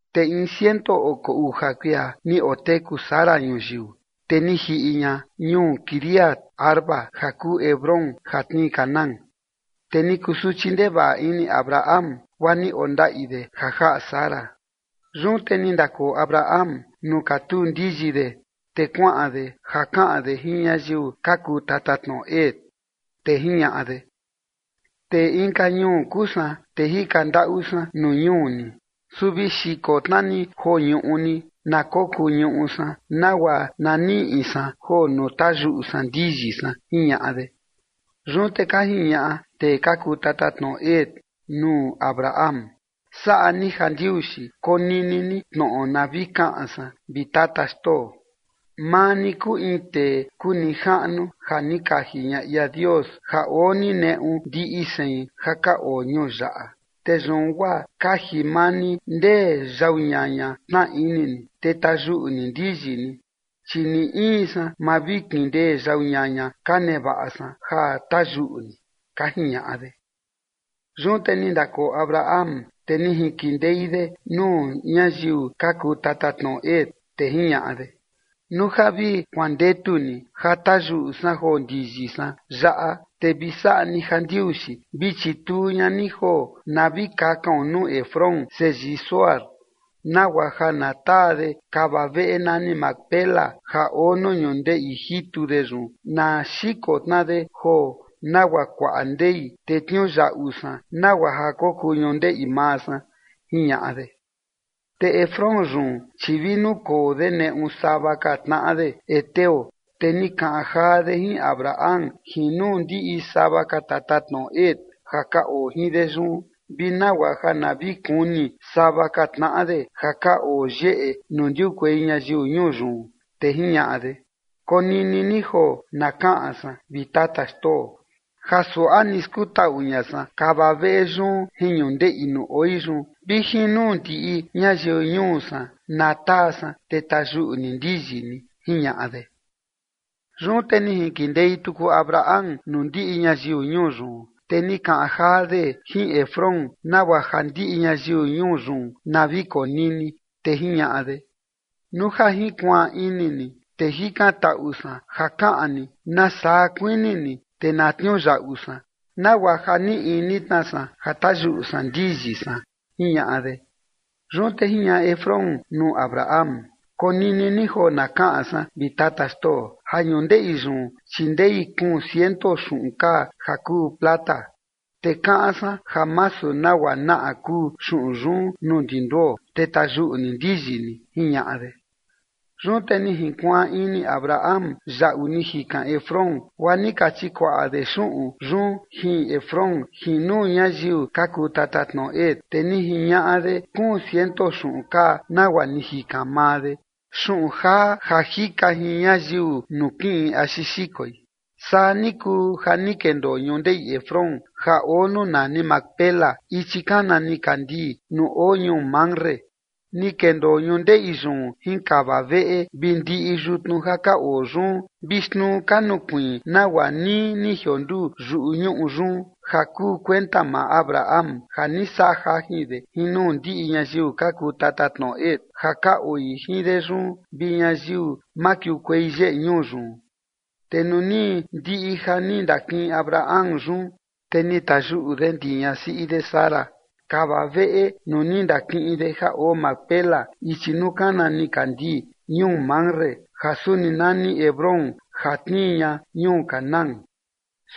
Te in ciento oko uja kuia ni oteku Sara ñuyiu. Te ni jiꞌi ña ñuu Quiriat-arba ja kuu Hebrón ja tnii Canaán, te ni kusuchi ndevaꞌa ini Abraham guaa ni ondaꞌi de ja jaꞌa Sara. Yun te ni ndakoo Abraham nuu katuu ndiyi de, te kuaꞌan de ja kaꞌan de jin ñayiu ka kuu tatatnoꞌo Het, te jiñaꞌa de: ―Tee inka ñuu kuu san, te jika ndaꞌu san nuu ñuu ni, su vi xiko tna ni joo ñuꞌu ni na kokuu ñuꞌu san nagua na niꞌi san joo nuu tayuꞌu san ndiyi san ―jiñaꞌa de. Yun te ka jiñaꞌa tee ka kuu tatatnoꞌo Het nuu Abraham: ―Saꞌa ni jandiuxi konini ni tnoꞌo na vi kaꞌan san, vi tata xtoo. Maa ni kuu in tee kuu nijaꞌnu ja ni kaji ña ia Dios ja oo ni neꞌu ndiꞌi sein ja ka oo ñuu yaꞌa. Te yun guaa kaji maa ni ndee yau ñaña tnaa ini ni, te tayuꞌu ni ndiyi ni, chi ni in san ma vi kindee yau ñaña ka nevaꞌa san ja tayuꞌu ni ―ka jiñaꞌa de. Yun te ni ndakoo Abraham, te ni jinkindei de nuu ñayiu ka kuu tatatnoꞌo Het. Te jiñaꞌa de: ―Nuu ja vi kuandetu ni ja tayuꞌu san joo ndiyi san yaꞌa, te vi saꞌa ni jandiuxi vi chituu ña ni joo na vi kakaon nuu Efrón seyii Zohar, nagua ja na taa de kava veꞌe nani Macpela ja oo nuu ñundeꞌi jitu de yun na xiko tna de joo nagua kuaꞌa ndei, te tniuyaꞌu san nagua ja kokuu ñundeꞌi maa san ―jiñaꞌa de. Te Efrón yun, chi vi nukoo de neꞌu sava ka tnaꞌa de heteo, te ni kaꞌan jaa de jin Abraham jin nuu ndiꞌi sava ka tatatnoꞌo Het ja ka oo jin de yun vi nagua ja na vi kuni sava ka tnaꞌa de ja ka oo yeꞌe nuu ndiukuei ñayiu ñuu yun, te jiñaꞌa de: ―Konini ni joo na kaꞌan san, vi tata xtoo, ja suaꞌa ni skutaꞌu ña san kava veꞌe yun jin ñundeꞌi nuu oi yun vi jin nuu ndiꞌi ñayiu ñuu san, na taa san te tayuꞌu ni ndiyi ni ―jiñaꞌa de. Yun te ni jinkindei tuku Abraham nuu ndiꞌi ñayiu ñuu yun, te ni kaꞌan jaa de jin Efrón, nagua ja ndiꞌi ñayiu ñuu yun na vi konini, te jiñaꞌa de: ―Nuu ja jinkuaan ini ni te jikantaꞌu san ja kaꞌan ni nasaa kuini ni, te na tniuyaꞌu san, nagua ja nii ini tna san ja tayuꞌu san ndiyi san ―jiñaꞌa de. Yun te jiñaꞌa Efrón nuu Abraham: ―Konini ni joo na kaꞌan san, vi tata xtoo, ja ñundeꞌi yun, chi ndei kuun ciento xuꞌun kaa ja kuu plata, te kaꞌan san ja masu nagua naꞌa kuu xuꞌun yun nuu ndi nduo, te tayuꞌu ni ndiyi ni ―jiñaꞌa de. Yun te ni jinkuaan ini Abraham yaꞌu ni jikan Efrón, guaa ni ka chikuaꞌa de xuꞌun yun jin Efrón jin nuu ñayiu ka kuu tatatnoꞌo Het, te ni jiñaꞌa de kuun ciento xuꞌun kaa nagua ni jikan maa de, xuꞌun jaa ja jika jin ñayiu nuu kiꞌin axi xikoi. Saa ni kuu ja ni kendoo ñundeꞌi Efrón ja oo nuu nani Macpela ichi kana nikandii nuu oo ñuu Mamre. Ni kendoo ñundeꞌi yun jin kava veꞌe vi ndiꞌi yutnu ja ka oo yun vi xtnuu ka nukuiin nagua nii ni jionduu yuꞌu ñuꞌu yun, ja kuu kuenta maa Abraham ja ni saꞌa jajin de jin nuu ndiꞌi ñayiu ka kuu tatatnoꞌo Het ja ka oo jin de yun vi ñayiu makiukuei yeꞌe ñuu yun. Te nuu ni ndiꞌi ja ni ndakiꞌin Abraham yun, te ni tayuꞌu de ndi ñasiꞌi de Sara kava veꞌe nuu ni ndakiꞌin de ja oo Macpela ichi nuu kana nikandii ñuu Mamre ja suni nani Hebrón ja tnii ña ñuu Canaán.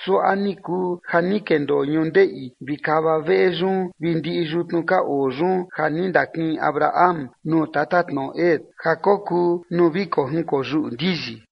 Suaꞌa ni kuu ja ni kendoo ñundeꞌi vi kava veꞌe yun vi ndiꞌi yutnu ka oo yun ja ni ndakiꞌin Abraham nuu tatatnoꞌo Het ja kokuu nuu vi kojinkoyuꞌu ndiyi.